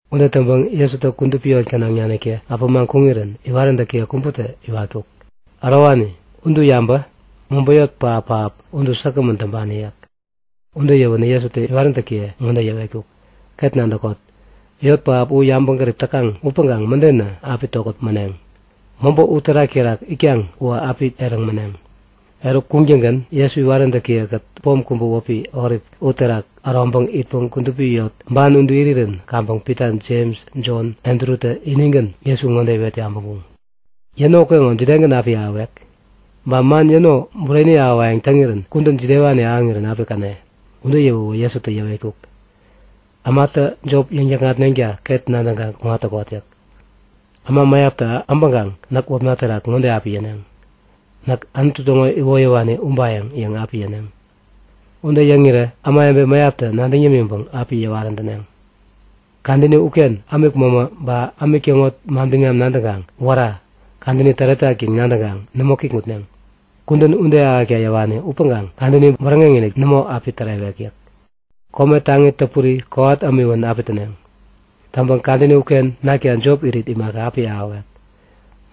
Ude täŋpäŋ Jesutä kudupi yot gänaŋ naniktä äpämaŋ kuŋirän iwaräntäki kubätä iwetkuk; Ärowani, udu yabä! Mobä yot pähap-pähap udu säkgämän täŋpani yäk. Ude yäwänä Jesutä iwaräntäkiye ŋode yäwetkuk; Ket nadäkot. Yot pähap u yabäŋgärip täkaŋ upäŋkaŋ mädenä api tokät mäneŋ. Mobä uterak terak itkaŋ uwä api eräŋ mäneŋ. Eruk kuŋtäŋgän Jesu iwaräntäkiye-kät pom kubä wäpi Olip uterak äroŋpäŋ itpäŋ kudupi yot ban udu irirän kaŋpäŋ Pita, Jems, Jon, Andrutä inigän Jesu ŋode iwet yabäŋkuŋ; Yäno ukeŋo jidegän api ahäwek? Ba man yäno bureni ahäwayäŋ täŋirän kudän jidewani ahäŋirän api käne? Ude yäwäwä Jesutä yäwetkuk; Ämatä jop yäŋ-täkŋatneŋta ket nadäŋkaŋ kuŋat täkot yäk. Äma mäyaptä äbäŋkaŋ näk wäpna terak ŋode api yäneŋ; Näk Anutu täŋo iwoyäwani ubayäŋ yäŋ api yäneŋ. Ude yäŋirä ämawebe mäyaptä nadäŋ yämiŋpäŋ api yäwarän täneŋ. Kadäni uken ämik mämä ba ämik täŋo manbiŋam nadäŋkaŋ Wära! Kadäni täretak yäŋ nadäŋkaŋ nämo kikŋutneŋ. Kudän ude ahäkta yäwani upäŋkaŋ kadäni bäräŋeŋ-inik nämo api tärewek yäk. Kome taŋi täpuri kowat ämiwän api täneŋ. Täŋpäŋ kadäni uken nakta jop irit imaka api ahäwek.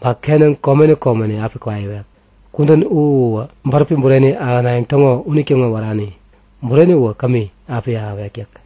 Ba kenäŋ komeni komeni api kwaiwek. Kudän u uwä bäräpi bureni ahänayäŋ täŋo unitäŋo wärani. Bureni u kämi api ahäwek yäk.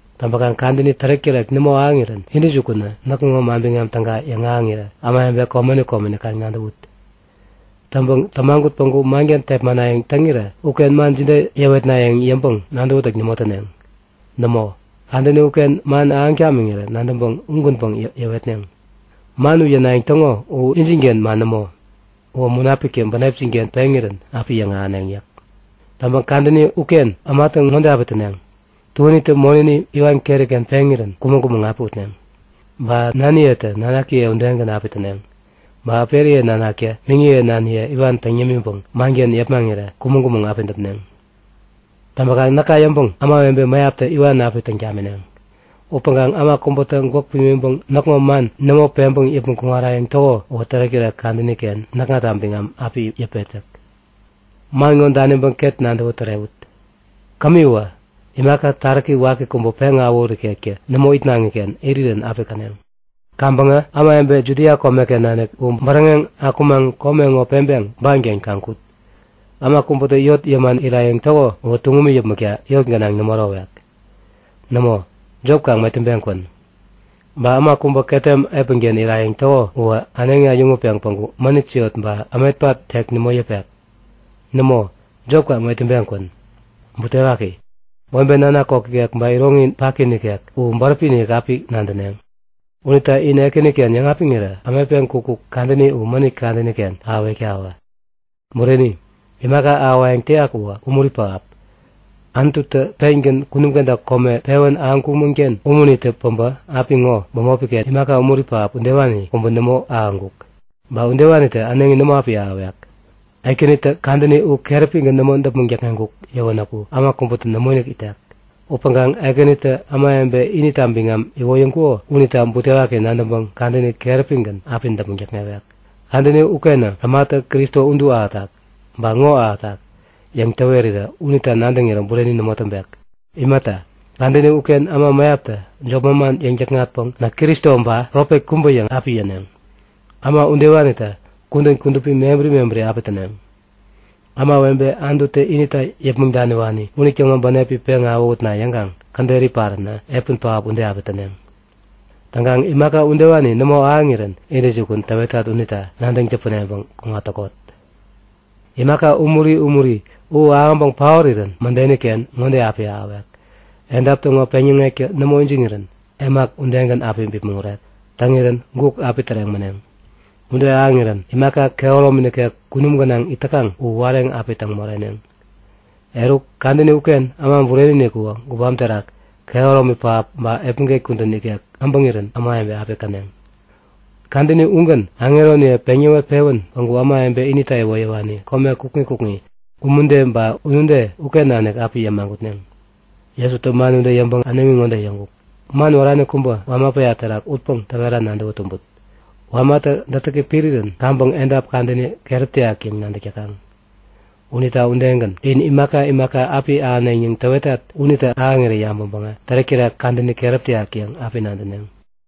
Täŋpäkaŋ kadäni tärek-tärek nämo ahäŋirän intäjukunä näkŋo Manbiŋam Täga yäŋahäŋirä ämawebe komeni komeni kaŋ nadäwut. Täŋpäŋ tämagut päŋku manken tepmanayäŋ täŋirä uken man jide yäwetnayäŋ yäŋpäŋ nadäwätäk nämo täneŋ. Nämo, kadäni uken man ahäŋ tamiŋirä nadäŋpäŋ ugänpäŋ yäwetneŋ. Man u yänayäŋ täŋo u injinken man nämo. Uwä Munapiktä bänepjin-ken peŋirän api yäŋahäneŋ yäk. Täŋpäŋ kadäni uken ämatä ŋode api täneŋ; Tuänitä monäni iwan keri-ken peŋirän kumäŋ-kumäŋ api utneŋ. Ba naniyetä nanakiye udegän api täneŋ. Ba äperiye nanaktä miŋiye naniye iwan täŋ yämiŋpäŋ manken yepmaŋirä kumäŋ-kumäŋ api däpneŋ. Täŋpäkaŋ näka yäŋpäŋ ämawebe mäyaptä iwan api täŋ tamineŋ. Upäŋkaŋ äma kubätä gwäk pimiŋpäŋ näkŋo man nämo peŋpäŋ yäpmäŋ kuŋarayäŋ täko uwä tärek-tärek kadäni-ken näkŋata biŋam api yäpet yäk. Man ŋo daniŋpäŋ ket ŋode nadäwä tärewut; Kämiwä, imaka taräki waki kubä peŋawähut ikektä nämo itnaŋiken irirän api käneŋ. Kaŋpäŋä ämawebe Judia komeken nanik u bäräŋeŋ akumaŋ kome ŋo peŋpeŋ banken kaŋ kut. Äma kubätä yot yäman irayäŋ täko uwä tuŋumi yäpmäkta yot gänaŋ nämo ärowek. Nämo, jop kaŋ metäŋpeŋ kwän. Ba äma kubä ketem epänken irayäŋ täko uwä äneŋi äyäŋutpeŋ päŋku mänit siot ba ämetpat tek nämo yäpek. Nämo, jop kaŋ metäŋpeŋ kwän. Butewaki! Webe nanak kok ikek ba iroŋi paki nikek u bäräpi-inik api nadäneŋ! Unita in Ekäniken yäŋapiŋirä ämetpeŋ kukkuk kadäni u mänit kadäni-ken ahäwektawä! Bureni, imaka ahäwayäŋ täyak uwä umuri pähap! Anututä pengän kunum kenta kome pewän ahäŋkumän-ken umunitä päbä apiŋo u bämopi-ken imaka umuri pähap udewani kubä nämo ahäŋkuk. Ba udewanitä äneŋi nämo api ahäwek. Ekänitä kadäni u keräpigän nämo däpmäŋ täkŋeŋkuk yäwänäku äma kubätä nämoinik itek. Upäŋkaŋ Ekänitä ämawebe inita biŋam iwoyäŋkuko unita butewaki nadäŋpäŋ kadäni keräpigän api däpmäŋ täkŋewek. Kadäni ukenä ämatä Kristo udu ahätak! Ba ŋo ahätak! yäŋ täwerirä unita nadäŋirä bureni nämo täŋpek. Imata, kadäni uken äma mäyaptä jop manman yäŋ-täkŋatpäŋ Näk Kristo ba profet kubä yäŋ api yäneŋ. Äma udewanitä kudän kudupi mebäri mebäri api täneŋ. Ämawebe Anututä inita yäpmäŋ daniwani unitäŋo bänepi peŋ awähutna yäŋkaŋ käderi paränä epän pähap ude api täneŋ. Täŋkaŋ imaka udewani nämo ahäŋirän intäjukun täwetat unita nadäŋ täpäneŋpäŋ kuŋat täkot! Imaka umuri umuri u ahäŋpäŋ paorirän mädeni-ken ŋode api ahäwek; Edap täŋo peŋyäŋektä nämo ijiŋirän, emak udegän api bipmäŋ urek. Täŋirän, guk api täreŋ mäneŋ. Ude ahäŋirän imaka kehäromi nikek kunum gänaŋ it täkaŋ u wareŋ api täŋ moreneŋ. Eruk, kadäni uken Äma Bureni-inik uwä gubam terak, kehäromi pähap ba epmäget kudän ikek äbäŋirän ämawebe api käneŋ. Kadäni ugän aŋeroniye peŋ yäwet-pewän päŋku ämawebe inita iwoyäwani kome kukŋi kukŋi, umude ba unude uken nanik api yämagutneŋ. Jesutä ude yäŋpäŋ äneŋi ŋode yäŋkuk; Man wärani kubä wama päya terak utpäŋ täwera nadäwä tumbut. Wamatä dätäki pirirän kaŋpäŋ edap kadäni keräp täyak yäŋ nadäk täkaŋ. Unita udegän in imaka imaka api ahäneŋ yäŋ täwetat unitä ahäŋirä yabäŋpäŋ tärek-tärek kadäni keräp täyak yäŋ api nadäneŋ.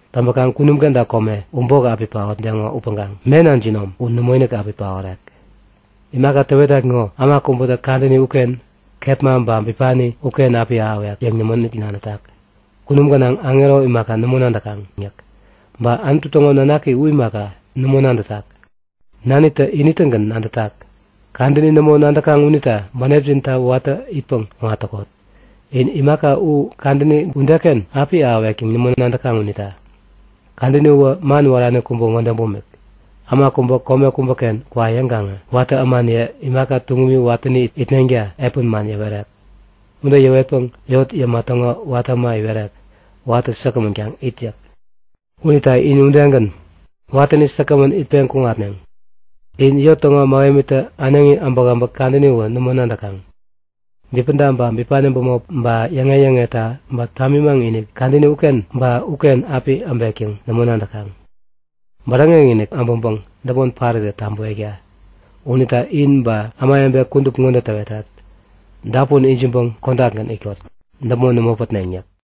Täŋpäkaŋ kunum kenta kome u bok api paotdeŋo upäŋkaŋ mena jinom u nämoinik api paorek. Imaka täwetat ŋo äma kubätä kadäni uken, kepma ba bipani uken api ahäwek yäŋ nämoinik nadätak. Kunum gänaŋ aŋero imaka nämo nadäkaŋ yäk. Ba Anutu täŋo Nanaki u imaka, nämo nadätak. Nanitä ini-tägän nadätak. Kadäni nämo nadäkaŋ unita bänepjinta watäni itpäŋ kuŋat täkot. In imaka u kadäni udeken api ahäwek yäŋ nämo nadäkaŋ unita. Kadäni uwä man wärani kubä ŋode bumik; Äma kubä kome kubäken kwa yäŋkaŋä watä ämaniye imaka tuŋumi watäni itneŋta epän man yäwerek. Ude yäwetpäŋ yot yäma täŋo watä äma iwerek; Watä säkgämän kaŋ it yäk. Unita inä udegän, watäni säkgämän itpeŋ kuŋatneŋ. In yot täŋo mähemitä äneŋi äbäkäbäk kadäni uwä nämo nadäkaŋ. Bipäda ba bipani bämop ba yäŋe-yäŋeta ba tamimaŋ-inik kadäni uken ba uken api äbek yäŋ nämo nadäkaŋ. Bäräŋek-inik äbäŋpäŋ däpmon parirä tabäwekta. Unita in ba ämawebe kudup ŋode täwetat; Dapun ijiŋpäŋ kodakgän itkot, däpmon nämo pätneŋ! yäk.